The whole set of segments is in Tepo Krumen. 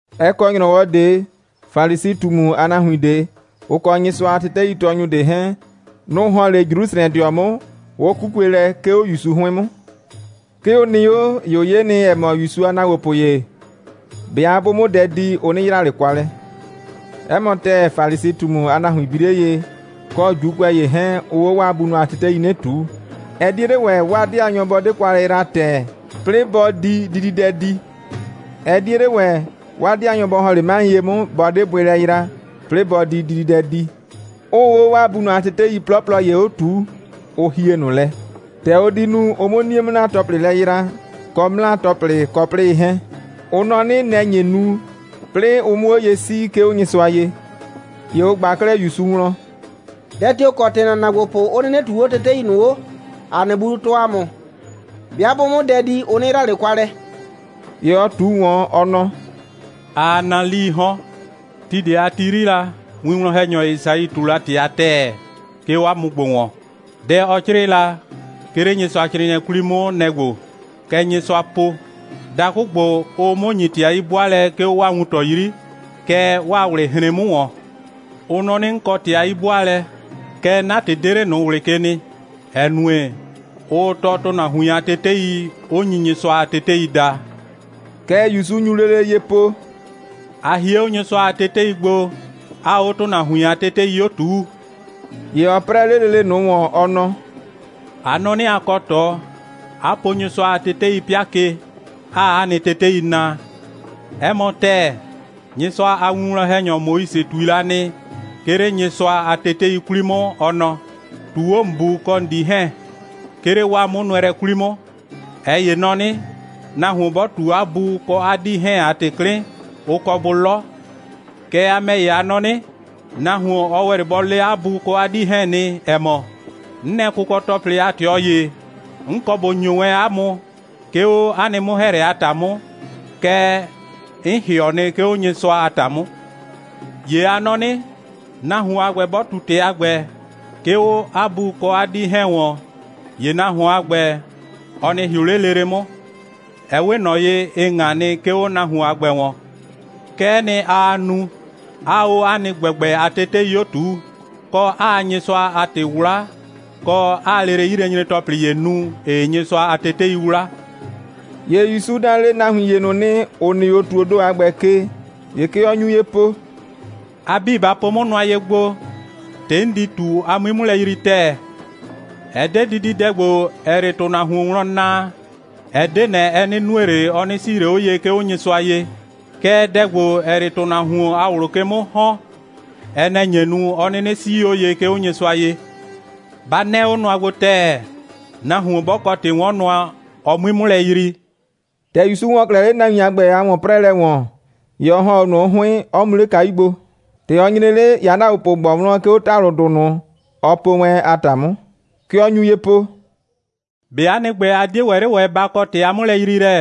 Ɛ kɔ ‑nyrɔwɔ ꞊de, Falisi꞊tumu a nahuin ꞊de, ʋ kɔ Nyɩsʋa a teteitɔɔnyʋ ꞊de 'hɛɛn, nʋ‑ ‑hɔn 'le Jrusrɛdɩɔ 'mʋ, 'ʋ 'kukue lɛ, 'ke 'o ‑Yusu 'hʋɩn 'mʋ. 'Ke ʋ nɩ 'o, ‑ye ʋ 'ye nɩ, ‑ɛ mɔ, ‑Yusu a ‑naagbopʋ ‑ye, 'bɩa 'bʋ 'mʋ dɛ di, ʋ 'nɩ yra ꞊le kwa lɛ. 'Ɛ mɔ ‑tɛɛ, Falisi꞊tumu a nahuin bi 'le ye, kɔ ‑Juukʋɛ ‑ye 'hɛɛn, ʋʋ 'o 'waa bunʋ a tetei 'o 'nɩ ꞊tuu. Ɛ 'die 'le ‑wɛ, 'waa 'dɩanyɔ bɔ 'de kwa lɛ yra ‑tɛɛ, 'plɩɩ bɔ di dididɛ di. Ɛ 'die 'le ‑wɛ, 'waa 'dɩanyɔ bɔ ‑hɔn 'le 'maɩ ye 'mʋ, bɔ 'de bʋɩ lɛ yra, 'plɩɩ bɔ di dididɛ di, 'ʋʋ 'o 'waa bunʋ a tetei 'plɔplɔ ‑ye 'o ꞊tuu, ʋ hie ꞊nʋ lɛ: ‑tɛ ʋ di nu, ʋ 'mʋ 'nie'mʋ'naapɔhlɩ lɛ yra, kɔ 'mlaa‑tɔplɩ, kɔ 'plɩyɩ 'hɛɛn. Ʋ nɔ 'nɩ, nɛ‑ nye nu, 'plɩɩ ʋ 'mʋ 'o ye 'sii, 'ke 'o Nyɩsʋa ye. ‑Ye ʋ ꞊gba 'klɛɛ ‑Yusu wlɔn: «Dɛ tio‑ kɔ ‑tɩ ‑na ‑naagbopʋ 'ʋ 'nɩnɩ ꞊tuu 'o tetei ꞊nʋ 'o, ‑a nɩ bunʋ tɔɔ ‑a mʋ? 'Bɩa 'bʋ 'mʋ dɛ di, ʋ 'nɩ yra ꞊le kwa lɛ.» ‑Ye ɔ ꞊tu ꞊wɔn, ɔ nɔ: «Aa naa 'lii 'hɔn. Ti ꞊de a ti 'yri la, winwlɔn‑hɛnyɔ Esai ꞊tu la ‑tɩ a ‑tɛɛ, 'ke 'o 'a mʋ ‑gbo ‑wɔn. Dɛ, ɔ 'crɩɩ la, 'ke 'le Nyɩsʋacrɩɩnɩɛ 'kwli 'mʋ, nɛ‑ ‑gbo: Kɛ Nyɩsʋa po: Dakʋ ‑gbo, ʋʋ 'mʋ ‑nyi ‑tɩ a 'yi'bʋaalɛ, 'ke 'o 'waa wuntɔ 'yri, kɛɛ, 'waa ꞊wlɩ hren 'mʋ ‑wɔn. Ʋ nɔ 'nɩ, 'n kɔ ‑tɩ a 'yi'bʋaalɛ, kɛɛ, 'na ‑tɩ 'de 'le ꞊nʋ ꞊wlɩ ke nɩ, ‑ɛ nue, ʋʋ tɔɔ ‑tʋnahuin a tetei, 'ʋ nyi Nyɩsʋa a tetei daa.» Kɛ ‑Yusu nyu lele ye po: «A hie 'o Nyɩsʋa a tetei gbo, 'aa 'o ‑tʋnahuin a tetei 'o ꞊tuu.» ‑Ye ɔ 'prɛɛ 'le lele ꞊nʋ ‑wɔn, ɔ nɔ: «A nɔ 'nɩ, a kɔ ꞊tɔ, 'a po Nyɩsʋa a tetei 'pɩa ke, 'aa 'a nɩ tetei naa. 'Ɛ mɔ ‑tɛɛ, Nyɩsʋa a winwlɔn‑hɛnyɔ Moise ꞊tui la nɩ, 'ke 'le Nyɩsʋa a tetei 'kwli 'mʋ, ɔ nɔ: ꞊Tuu 'o ‑n bu kɔ ‑n 'dii 'hɛɛn, 'ke 'le 'waa 'mʋnʋɛlɛ 'kwli 'mʋ! ꞊Ɛ ‑ye nɔ 'nɩ: Nahuon 'bɔ ꞊tu 'a bu kɔ 'a 'dii 'hɛɛn a ‑tɩ 'klɩn, ʋ kɔ bʋ 'lɔ. Kɛɛ, a ‑mɛ ‑ye, a nɔ 'nɩ: Nahuon, ɔ ‑wɛ 'le bɔ le 'a bu kɔ 'a 'dii 'hɛɛn nɩ, ‑ɛ mɔ: 'N nɛ kʋkɔ‑tɔplɩ a ꞊tɩɔ ‑ye, 'n kɔ ꞊bo ‑nyo wɛn 'a mʋ, 'ke 'o 'a nɩ 'mʋ‑hɛɛlɛ a ‑ta 'mʋ, kɛɛ, 'n ‑hɩɔ nɩ, 'ke 'o Nyɩsʋa a ‑ta 'mʋ. ‑Ye a nɔ 'nɩ: Nahuon a ‑gbɛ 'bɔ ꞊tu ‑tɩ a ‑gbɛ, 'ke 'o 'a bu kɔ 'a 'dii 'hɛɛn ‑wɔn, ‑ye nahuon a ‑gbɛ, ɔ nɩ ‑hɩʋ 'le lele 'mʋ. Ɛ 'we ꞊nɔ ye, ɩ ꞊ŋa nɩ, 'ke 'o nahuon a ‑gbɛ ‑wɔn. Kɛ'ɛ nɩ, aa nu, 'aa 'o 'a nɩ ‑gbɛgbɛ a tetei 'o ꞊tuu, kɔ, 'aa Nyɩsʋa a ‑tɩ 'wla, kɔ, 'aa lele 'yilɛnyre‑tɔplɩ ‑ye nu, ‑ɩɩ Nyɩsʋa a tetei 'wla.» ‑Ye ‑Yusu da lele nahuin ‑ye ꞊nʋ nɩ, ‑ʋ nɩ 'o ‑tuoo ‑do a ‑gbɛ ke. ‑Ye kɛ ɔ nyu ye po: «A 'bii, ba po 'mʋ nʋa ye gbo, ‑tɩ, 'n di ꞊tu, a 'mui 'mʋ lɛ yrii ‑tɛɛ! Ɛ 'de dididɛ ‑gbo, ‑ɛɛ 'le ‑tʋnahuon wlɔn naa, ɛ 'de ꞊nɛ, ɛ 'nɩ nue ꞊le, ɔ 'nɩ 'sii ꞊le 'o ye, 'ke 'o Nyɩsʋa ye. Kɛɛ, dɛ ‑gbo, ‑ɛɛ 'le ‑tʋnahuon a ꞊wlʋ ke 'mʋ ‑hɔn, ɛ nɛ‑ nye nu, 'ɔ 'nɩnɩ 'sii 'o ye, 'ke 'o Nyɩsʋa ye. Ba 'nɛɛ 'o nʋa gbo ‑tɛɛ, nahuon 'bɔ kɔ ‑tɩ'wɔnnʋa, ɔ 'mui 'mʋ lɛ yrii!» ‑Tɛ ‑Yusu ‑wɔ 'klɛɛ 'le nahuin a ‑gbɛ a ‑wɔn'prɛɛlɛ ‑wɔn, ‑ye ɔ ‑hɔn 'o ꞊nʋ 'mʋ 'hʋɩn, 'ɔ mu 'le kayu gbo. ‑Tɛ ɔ nyre 'le, ‑ye 'a ‑naagbopʋ ꞊gbɔ wlɔn, 'ke 'o ‑talʋdʋ ꞊nʋ, ɔ po wɛn, a ‑ta 'mʋ. Kɛ ɔ nyu ye po: «꞊Be 'a nɩ ‑gbɛ, a 'die ‑wɛ 'le ‑wɛ ba kɔ ‑tɩ a 'mʋlɛyriilɛ?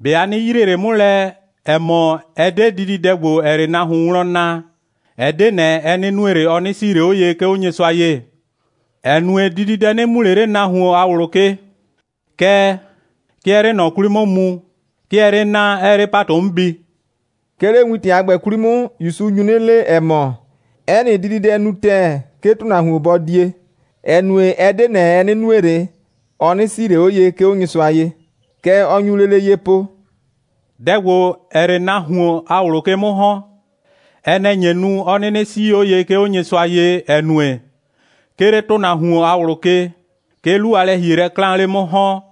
꞊Be a 'nɩ yrie ꞊le 'mʋ lɛ, ‑ɛ mɔ, ɛ 'de dididɛ ‑gbo, ‑ɛɛ 'le nahuon wlɔn naa, ɛ 'de ꞊nɛ, ɛ 'nɩ nue ꞊le, ɔ 'nɩ 'sii ꞊le 'o ye, 'ke 'o Nyɩsʋa ye? ‑Ɛ nue, dididɛ 'nɩ mu ꞊le 'le nahuon a ꞊wlʋ ke. Kɛɛ, 'ke ɛɛ 'le ꞊nɔ 'kwli 'mʋ mu, 'ke ɛɛ 'le naa, 'ɛɛ 'le ‑patʋ 'mʋ bi.» 'Ke 'le wintɛ a ‑gbɛ 'kwli 'mʋ, ‑Yusu nyu 'nɩ le, ‑ɛ mɔ, 'ɛ nɩ dididɛ nu ‑tɛɛ, 'ke ‑tʋnahuon bɔ die, ‑ɛ nue, ɛ 'de ꞊nɛ, ɛ 'nɩ nue ꞊le, ɔ 'nɩ 'sii ꞊le 'o ye, 'ke 'o Nyɩsʋa ye. Kɛ ɔ nyu lele ye po: «Dɛ ‑gbo, ‑ɛɛ 'le nahuon a ꞊wlʋ ke 'mʋ ‑hɔn, ɛ nɛ‑ nye nu, 'ɔ 'nɩnɩ 'sii 'o ye, 'ke 'o Nyɩsʋa ye, ‑ɛ nue, 'ke 'le ‑tʋnahuon a ꞊wlʋ ke, 'ke 'lu a lɛ‑hielɛ 'klaan 'le 'mʋ ‑hɔn,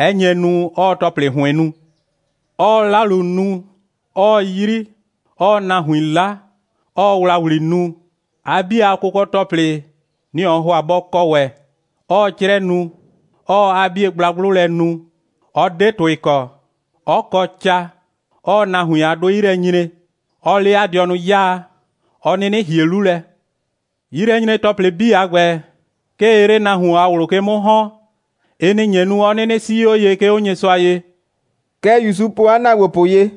'ɛ nye nu, 'ɔɔ ‑tɔplɩ ‑hʋɩn nu: 'ɔɔ 'lalu nu, 'ɔɔ 'yri, 'ɔɔ nahuin 'la, 'ɔɔ ‑wlawli nu, 'a 'bie a kʋkɔ‑tɔplɩ, nɩ‑ ɔɔ ‑hʋa bɔ kɔ ‑wɛ, 'ɔɔ 'crɛ nu, 'ɔɔ 'a 'bie gblagblʋ lɛ nu, 'ɔ 'de ‑tʋɩ kɔ, 'ɔ kɔ ca, 'ɔɔ nahuin a 'dʋɩ 'yi lɛ nyre, 'ɔɔ 'le 'a dɩɔnʋ 'yaa, 'ɔ 'nɩnɩ ‑hie 'lu lɛ. 'Yilɛnyre‑tɔplɩ 'bii a ‑gbɛ, 'ke ɩɩ 'le nahuon a ꞊wlʋ ke 'mʋ ‑hɔn. Ɩ nɩ‑ nye nu, 'ɔ 'nɩnɩ 'sii 'o ye, 'ke 'o Nyɩsʋa ye.» Kɛ ‑Yusu po 'a ‑naagbopʋ ye.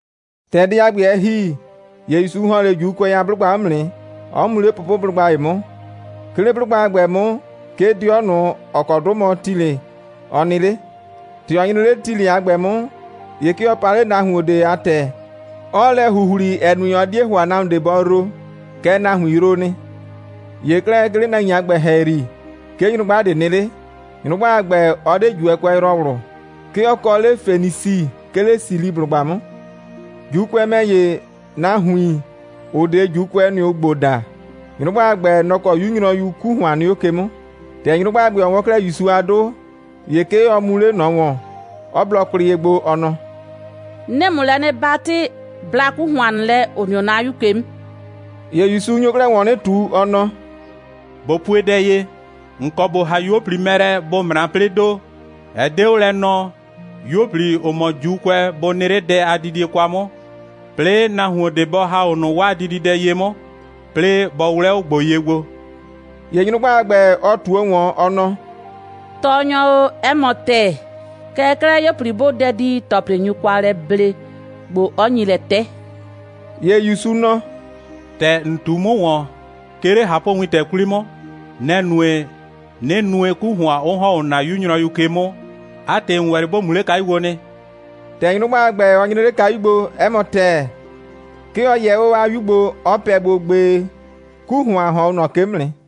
‑Tɛ dɛ a ‑gbɛ, ɛ ‑hi, ‑ye ‑Yusu ‑hɔn 'le ‑Juukʋɛ a 'blʋgba 'mʋ nɩ, 'ɔ mu 'le pʋpʋblʋgba ‑ye 'mʋ. 'Ke 'le 'blʋgba a ‑gbɛ 'mʋ, 'ke 'dɩɔ ꞊nʋ, ‑ɔ kɔ 'dʋ mɔ Tilɩ, ɔ nɩ 'le. ‑Tɛ ɔ nyre 'le Tilɩ a ‑gbɛ 'mʋ, ‑ye 'ke ɔ pa 'le nahuon ꞊de a ‑tɛ, 'ɔɔ lɛ ‑huhli, ‑ɛ nue, ɔ 'die ‑hʋa, 'ke nahuon ꞊de bɔ yroo. Kɛɛ, nahuin yroo nɩ. ‑Ye 'klɛɛ, 'ke 'le nahuin a ‑gbɛ ‑hɛyri, 'ke nyrʋgba ꞊de nɩ 'le. Nyrʋgba a ‑gbɛ, ɔ 'de ‑Juukʋɛyrɔwlʋ. 'Ke ɔ kɔ 'le Fenisi, 'ke 'le Siliblʋgba 'mʋ. (‑Juukʋɛ ‑mɛ ‑ye, nahuin, ‑ʋ 'de ‑Juukʋɛ, nʋ‑ ʋʋ ‑gbo daa.) Nyrʋgba a ‑gbɛ, nɔ‑ kɔ 'yu nyrɔyu 'ku ‑hʋan nɩ 'o ke 'mʋ. ‑Tɛ nyrʋgba a ‑gbɛ, ɔ 'wɔn 'klɛɛ ‑Yusu a 'dʋ, ‑ye 'ke ɔ mu 'le ꞊nɔ ‑wɔn, 'ɔ blɔ kwlɩ ye gbo, ɔ nɔ: «'Nɩɩ ‑mʋ lɛ 'nɩ 'batɩ, bla 'ku ‑hʋan ꞊nʋ lɛ, ‑ʋ nɩ 'o 'na 'yu ke 'mʋ.» ‑Ye ‑Yusu nyo 'klɛɛ ‑wɔn 'nɩ ꞊tu, ɔ nɔ: «꞊Bo pue dɛ ye: ‑N kɔ ‑bo ‑ha 'yuo꞊pli mɛ lɛ, bʋ ꞊mra, 'plɩɩdo. Ɛ 'de 'o lɛ nɔɔ, 'yuo꞊pli, ‑ʋ mɔ ‑Juukʋɛ, bʋ nɩ 'le dɛ a didie kwa 'mʋ, 'plɩɩ nahuon ꞊de bɔ ‑ha 'o ꞊nʋ 'waa dididɛ ye 'mʋ, 'plɩɩ bɔ 'wlɛ 'o ‑gbo ye gbo.» ‑Ye nyrʋgba a ‑gbɛ, ɔ ꞊tuo ‑wɔn, ɔ nɔ: «Tɔɔnyɔ o, 'ɛ mɔ ‑tɛɛ. Kɛɛ 'klɛɛ, 'yuo꞊pli 'bʋʋ dɛ di, ‑tɔplɩ nyu kwa lɛ ble, ‑gbo 'ɔ nyi lɛ 'tɛ.» ‑Ye ‑Yusu nɔ: «‑Tɛ ‑n ꞊tu 'mʋ ‑wɔn, 'ke 'le ꞊hapʋwintɛ 'kwli 'mʋ, nɛ‑ nue, 'nɩ nue, 'ku ‑hʋan 'ʋ ‑hɔn 'o ‑na 'yu nyrɔyu ꞊nʋ ke 'mʋ. 'A ‑tɩ, ‑n ‑wɛ 'le ‑bo mu 'le kayu gbo nɩ.» ‑Tɛ nyrʋgba a ‑gbɛ, ɔ nyre 'le kayu gbo, 'ɛ mɔ ‑tɛɛ, 'ke ɔ yɛ 'o 'a 'yu gbo, 'ɔ pɛ gbo, gbee. 'Ku ‑hʋan ‑hɔn 'o ꞊nɔ ke 'mʋ nɩ.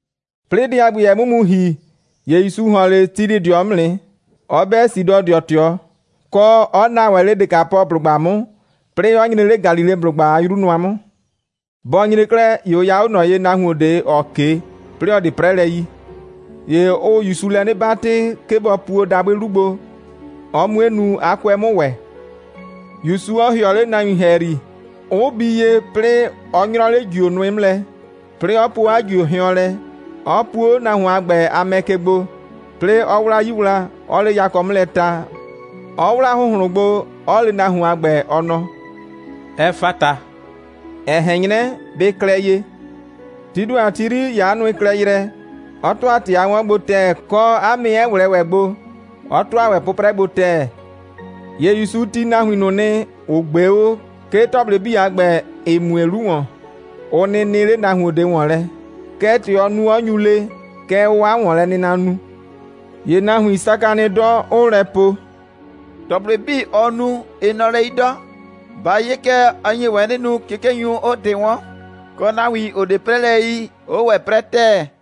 'Plɩɩ dɛ a ‑gbɛ, ɛ 'mʋ mu ‑hi, ‑ye ‑Yusu ‑hɔn 'le Tilɩdɩɔ 'mʋ nɩ, 'ɔ 'bɛ Sidɔdɩɔ ꞊tɩɔ, kɔ, 'ɔ naa ‑wɛ 'le Dekapɔblʋgba 'mʋ, 'plɩɩ, 'ɔ nyre 'le Galileblʋgba a 'yru nʋa 'mʋ. Bɔ nyre 'klɛɛ, ‑ye ʋ ya 'o ꞊nɔ ye nahuon ꞊de, ‑ɔ 'ke, 'plɩɩ ‑ɔ 'de 'prɛlɛ yi. ‑Ye ʋʋ ‑Yusu lɛ 'nɩ 'batɩ, 'ke bɔ puo dabʋɩ 'lu gbo, ɔ 'mue nu, 'a 'kʋɛ 'mʋ ‑wɛ, ‑Yusu 'ɔ ‑hɩɔ 'le nahuin ‑hɛyri, 'ʋ bii ye, 'plɩɩ 'ɔ 'nyrɔ 'le ‑jio nʋɩ 'mʋ lɛ, 'plɩɩ 'ɔ po 'a ‑jio hɩɔn lɛ, 'ɔ puo 'o nahuon a ‑gbɛ a mɛ ke gbo, 'plɩɩ 'ɔ 'wla 'yii wla, 'ɔɔ 'le yakɔ 'mʋ lɛ ta, 'ɔ 'wla ‑hʋnhlʋn gbo, 'ɔ le nahuon a ‑gbɛ, ɔ nɔ: «Ɛfata!» ‑ɛ ꞊hɛn 'nyrɛ: «Bɩ klɛ ye.» Tii ‑do a ti 'yri, ‑ye 'a nʋɩ klɛ yrɛ, 'ɔ ‑tʋa ‑tɩ a 'wʋnwɔn gbo ‑tɛɛ, kɔ, 'a mɛ 'ɛ ꞊wlɛɛ ‑wɛ gbo, 'ɔ ‑tʋa ‑wɛ 'pʋprɛ gbo ‑tɛɛ. ‑Ye ‑Yusu tii nahuin ꞊nʋ nɩ, ‑ʋ ꞊gbee 'o, 'ke ‑tɔplɩ 'bii a ‑gbɛ, ‑ɩ mue 'lu ‑wɔn, ʋ nɩ nɩ 'le nahuon ꞊de ‑wɔn lɛ. Kɛɛ, ‑tɛ ɔɔ nu, 'ɔ nyu le, kɛ ʋʋ 'a ‑wɔnlɛnɩna nu. ‑Ye nahuin saka nɩ 'dɔ, 'ʋʋ lɛ po: «‑Tɔplɩ 'bii, ɔɔ nu, ɩ nɔ lɛ 'yi 'dɔ. Ba 'ye kɛ, ɔ nye ‑wɛ 'nɩ nu, 'kikenyʋ 'ʋʋ ‑tɩ 'wɔn, kɔ nahuin, ‑ʋ 'de 'prɛlɛ yi, 'ʋʋ ‑wɛ 'prɛ ‑tɛɛ.»